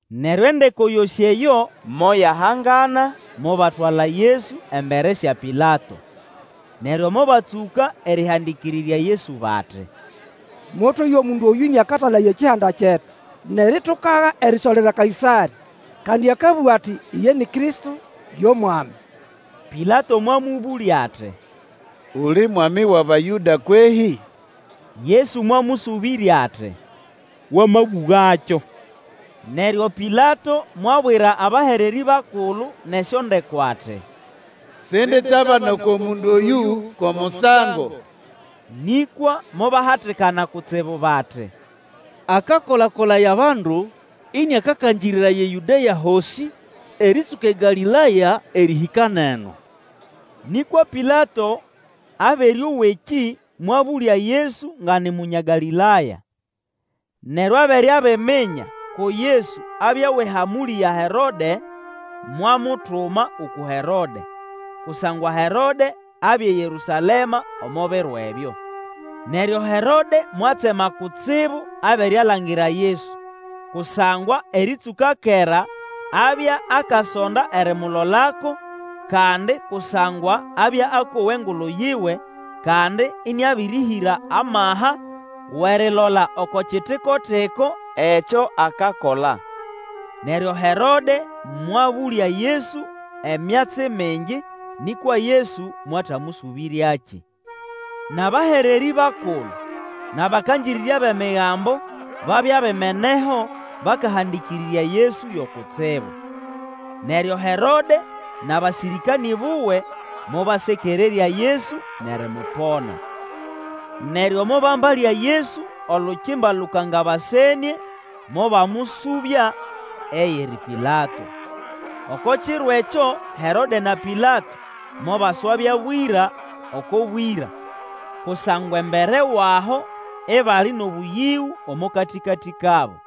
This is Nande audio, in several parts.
Neryo endeko yosĩ eyo moyahangana mobatwala Yesu embere sya Pilato. Neryo mobatsũka erĩhandĩkĩrĩrya Yesu bati, Motweya omundu oyũ ĩnĩakatalaya ekihanda kyetu, nʼeritukaga erisolera Kaĩsarĩ. Kandi akabũga ati iye ni Kristo yo mwami. Pilato mwamũbũlya ati, Uli mwami wʼAbayũda kwehĩ? Yesu mwamũsũbĩrya ati, Wamabũgakyo. Neryo Pilato mwabwira abahererĩ bakulu nʼesyondeko ati, Sinditabana oko mundu oyũ ko musango. Nĩkwa mobahatikana kutsibu bati, Akakola-kolaya bandu, ĩnĩakakangĩrĩraya eYũdea hosĩ, erĩtsũka eGalĩlaya erĩhĩka nʼeno. Nĩkwa Pilato abere owa ekĩ, mwabũlya Yesu nga ni Munya Galĩlaya. Neryo abere abiminya ko Yesu abya wʼehamũlĩ ya Herode, mwamutuma uku Herode, kusangwa Herode abya eYerũsalema omo biro ebyo. Neryo Herode mwatsema kutsibu abere alangira Yesu; kusangwa erĩtsũka kera abya akasonda erimulolako, kandi kusangwa abya akowa engulu yiwe, kandi ĩnĩabĩrĩhĩra amaha wʼerilola oko kitiko-tiko ekyo akakola. Neryo Herode mwabũlya Yesu emyatsi mingi, nĩkwa Yesu mwatamũsũbĩryakĩ. Nʼabahererĩ bakulu nʼabakangĩrĩrya bʼEmigambo babya bimeneho bakahandĩkĩrĩrya Yesu yo kutsibu. Neryo Herode nʼabasĩrĩkanĩ buwe, mobasekererya Yesu nʼerimupona. Neryo mobambalya Yesu olukimba lũkangabasenĩe, mobamũsũbya eyiri Pilato. Oko kiro ekyo Herode na Pilato mobaswabya bwĩra oko bwĩra, kusangwa embere wʼaho ibali nʼobũyĩgũ omo katĩkatĩ kabo.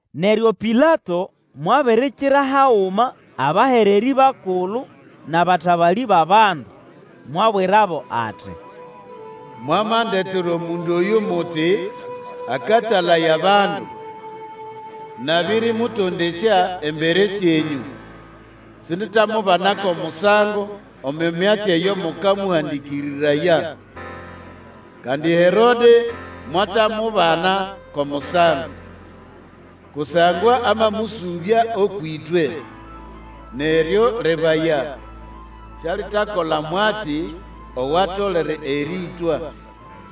Neryo Pilato mwabirikirira haguma abahererĩ bakulu, nʼabatabalĩ bʼabandu, mwabwirabo ati, Mwamandetera omundu oyũ muti, akatalaya abandu. Nabĩrĩmũtondesya embere syenyũ, sinditamubana ko musango omo myatsi eyo mukamũhandĩkĩrĩraya. Kandi Herode mwatamubana ko musango, kusangwa amamũsũbya ũkwʼĩtwe, neryo, lebaya, sialitakola mwatsi owatolere erĩĩtwa.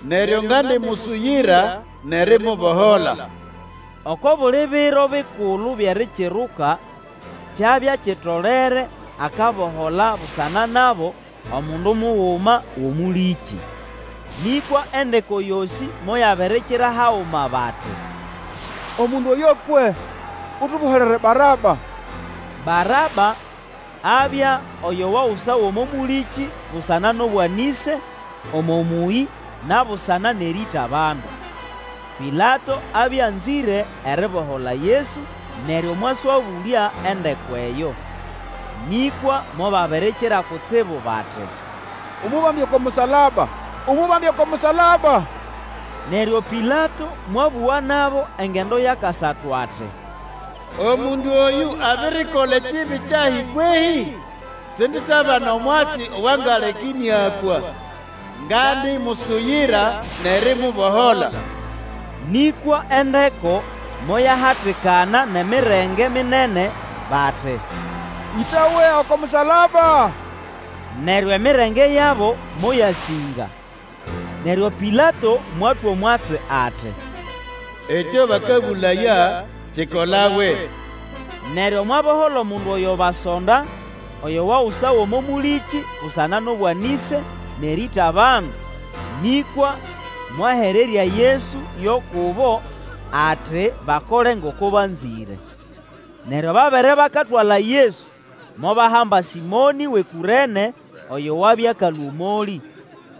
Neryo ngandimusuyira nʼerimubohola. [ Oko buli Biro Bikulu byʼErikiruka kyabya kitolere akabohola busana nabo omundu muguma wʼomũlĩkĩ.] Nĩkwa endeko yosĩ moyabirikira haguma bati, Omundu oyo akwe, utoboholere Baraba! Baraba abya oyo wagusawa omo mũlĩkĩ busana nʼobwanĩse omo mũyĩ na busana nʼerĩĩta abandu. Pilato abya anzĩre eribohola Yesu, neryo mwaswabũlya endeko eyo. Nĩkwa mobabirikira kutsibu bati, Umubambe oko musalaba! Umubambe oko musalaba! Neryo Pilato mwabũga nabo engendo yʼakasatu ati, Omundu oyũ abirikola kibi kyahi kwehĩ? Sinditabana omwatsi owangaleka ĩnĩakwa. Ngandimusuyira nʼerimubohola. Nĩkwa endeko moyahatikana nʼemirenge minene bati ĩtawe oko musalaba! Neryo emirenge yabo moyasĩnga. Neryo Pilato mwatwa omwatsi ati, ekyo bakabũlaya kikolawe. Neryo mwabohola omundu oyo basonda, oyo wagusawa omo mũlĩkĩ busana nʼobwanĩse nʼerĩĩta abandu, nĩkwa mwahererya Yesu yo kubo ati bakole ngoko banzĩre. Neryo babere bakatwala Yesu, mobahamba Sĩmonĩ wʼeKũrene oyo wabya akalũa omolĩ,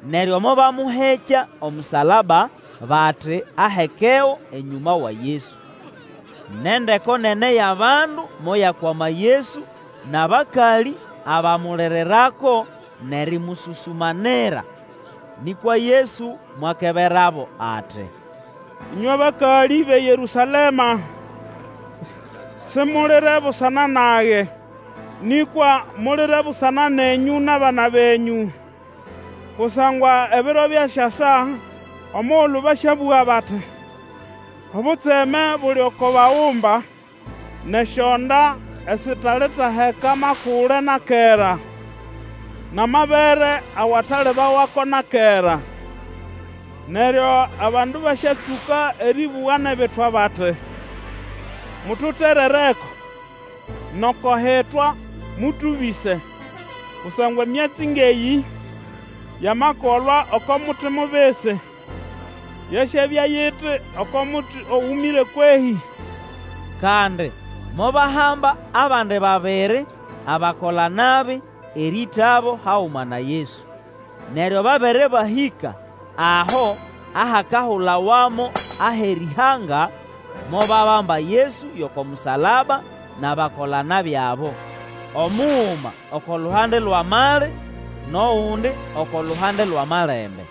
neryo mobamũhekya omusalaba bati ahekego enyũma wa Yesu. Nʼendeko nene yʼabandu moyakwama Yesu, nʼabakalĩ abamulirirako nʼerĩmũsũsũmanira. Nĩkwa Yesu mwakeberabo ati, Ĩnywe bakalĩ bʼeYerũsalema! Simulire busana nage, nĩkwa mulire busana nenyũ nʼabana benyũ. Kusangwa ebiro byasyasa omugulu basyabũga bati, Obutseme buli oko bagumba, nʼesyonda esitalitaheka makule na kera, nʼamabere awatalibawako na kera! Neryo abandu basyatsũka erĩbũga nʼebitwa bati, Mututerereko! nʼoko hitwa, Mũtũbĩse! Kusangwa emyatsi ngʼeyĩ yamakolwa oko muti mubisi, yasyabya yiti oko muti ogũmĩre kwehĩ? Kandi mobahamba abandi babiri, abakola-nabi, erĩĩtabo haguma na Yesu. Neryo babere bahĩka aho ahakahulawa mo Aherĩhanga, mobabamba Yesu yʼoko musalaba nʼabakola-nabi abo, omuguma oko luhande lwʼamali, nʼogundi oko luhande lwʼamalembe.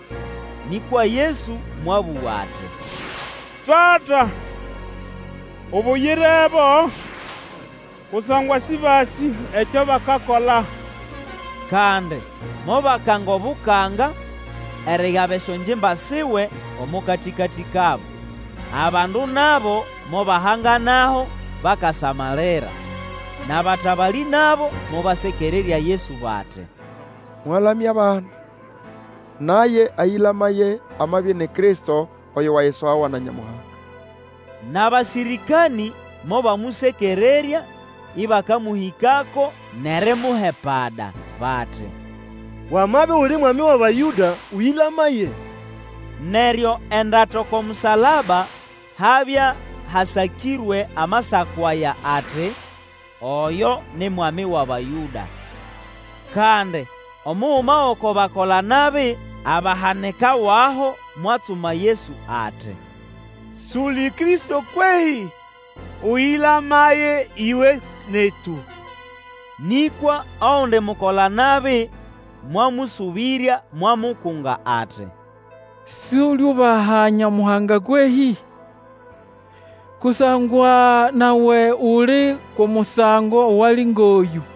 Nĩkwa Yesu mwabũga ati, Tata ubuyirebo kusangwa sĩbasĩ ekyo bakakola! Kandi mobakanga obukanga, erigaba esyongimba siwe omo katĩkatĩ kabo. Abandu nabo mobahanganaho bakasamalira. Nʼabatabalĩ nabo mobasekererya Yesu bati, Mwalamya abandi; naye ayĩlamaye amabya ini Kristo oyo wayisogawa na Nyamuhanga. Nʼabasĩrĩkanĩ mobamũsekererya, ĩbakamũhĩkako nʼerimuha epada, bati, Wamabya uli Mwami wʼAbayũda, ũyĩlamaye! Neryo endata oko musalaba habya hasakĩrwe amasako aya ati, OYO NI MWAMI WʼABAYŨDA. Kandi omuguma gʼoko bakola-nabi abahanikawaho mwatsuma Yesu ati, Suli Kristo kwehĩ? Ũyĩlamaye iwe netu! Nĩkwa ogundi mukola-nabi mwamũsũbĩrya, mwamukunga ati, Suliubaha Nyamuhanga kwehĩ? Kusangwa nawe uli kʼomusango owali ngʼoyũ.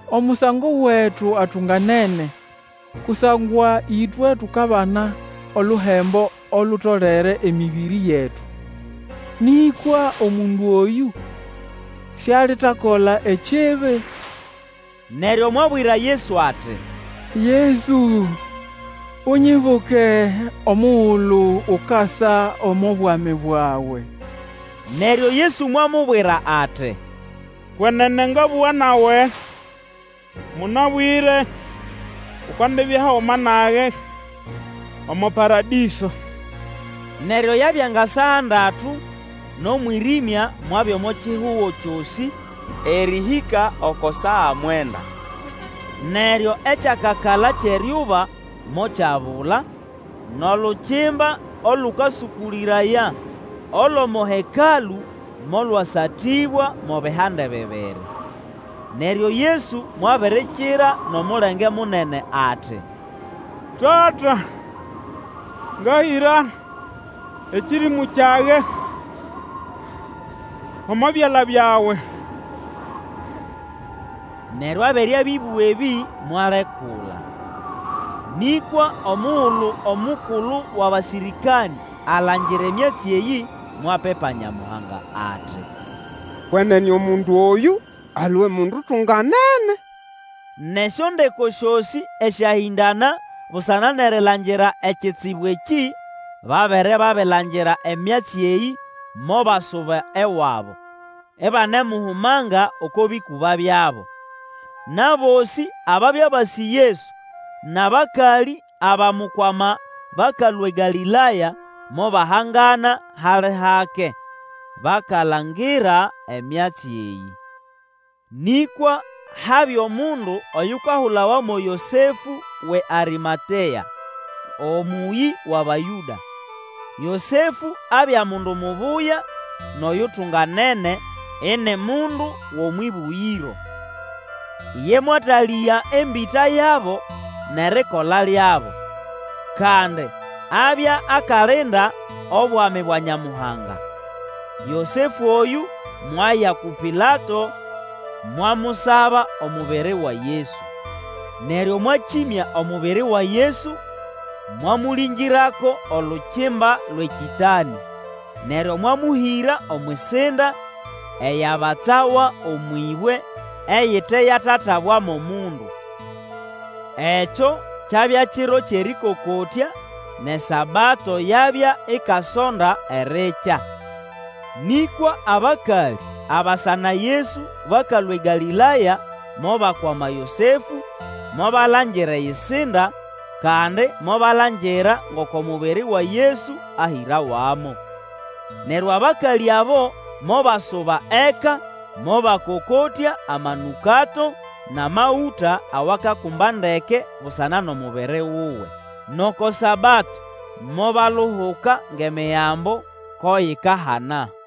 Omusango wetu atunganene, kusangwa ĩtwe tukabana oluhembo olutolere emĩbĩrĩ yetu; nĩkwa omundu oyũ sialitakola ekibi. Neryo mwabwira Yesu ati, Yesu unyibuke omugulu ukasa omo bwami bwawe! Neryo Yesu mwamubwira ati, Kwenene ngabũga nawe; mũnabwĩre Ukandibya haguma nage omo Paradĩso. Neryo yabya nga saa ndatu, nʼomwĩrĩmya mwabya omo kihugo kyosĩ erĩhĩka oko saa mwenda. Neryo ekyakakala kyʼeryuba mokyabula; nʼolukimba olũkasũkũlĩraya olʼomo Hekalũ molwasatĩbwa mo bihande bibiri. Neryo Yesu mwabirikira nʼomulenge munene ati, Tata, ngahĩra ekĩrĩmũ kyage omo byala byawe! Neryo abere abĩbũga ebĩ, mwalekula. Nĩkwa omugulu omukulu wʼabasĩrĩkanĩ alangira emyatsi eyĩ, mwapipa Nyamuhanga ati, Kwenene omundu oyũ alwe mundu utunganene. Nʼesyondeko syosĩ esyahĩndana busana nʼerilangira ekitsibu ekĩ, babere babilangira emyatsi eyĩ mobasuba ewabo, ibanemuhumanga oko bĩkũba byabo. Nʼabosĩ ababya basĩ Yesu, nʼabakalĩ abamukwama bakalũa eGalĩlaya, mobahangana hali hake; bakalangira emyatsi eyĩ. Nĩkwa habya omundu oyukahulawa mo Yosefũ wʼeArĩmatea, omũyĩ wʼAbayũda. Yosefũ abya mundu mubuya, nʼoyutunganene ini mundu wʼomwʼĩbũgĩro. Iye mwatalĩga embĩta yabo nʼerikola lyabo. Kandi abya akalinda obwami bwa Nyamuhanga. Yosefũ oyũ mwaya uku Pilato, mwamusaba omubiri wa Yesu. Neryo mwakĩmya omubiri wa Yesu, mwamũlĩngĩrako olukimba lwʼekĩtanĩ, neryo mwamũhĩra omwʼisinda eyabatsawa omwʼĩbwe, eyite yatatabwamo mundu. Ekyo kyabya kiro yʼErĩkokotya, nʼeSabato yabya ikasonda erikya. Nĩkwa abakalĩ abasa na Yesu bakalũa eGalĩlaya mobakwama Yosefũ, mobalangira eyisinda, kandi mobalangira ngoko mubiri wa Yesu ahĩrawamo. Neryo abakalĩ abo mobasuba eka mobakokotya amanũkato nʼamagũta awakakumba ndeke busana nʼomubiri wuwe. Nʼoko Sabato mobaluhuka ngʼEmigambo ko yikahana.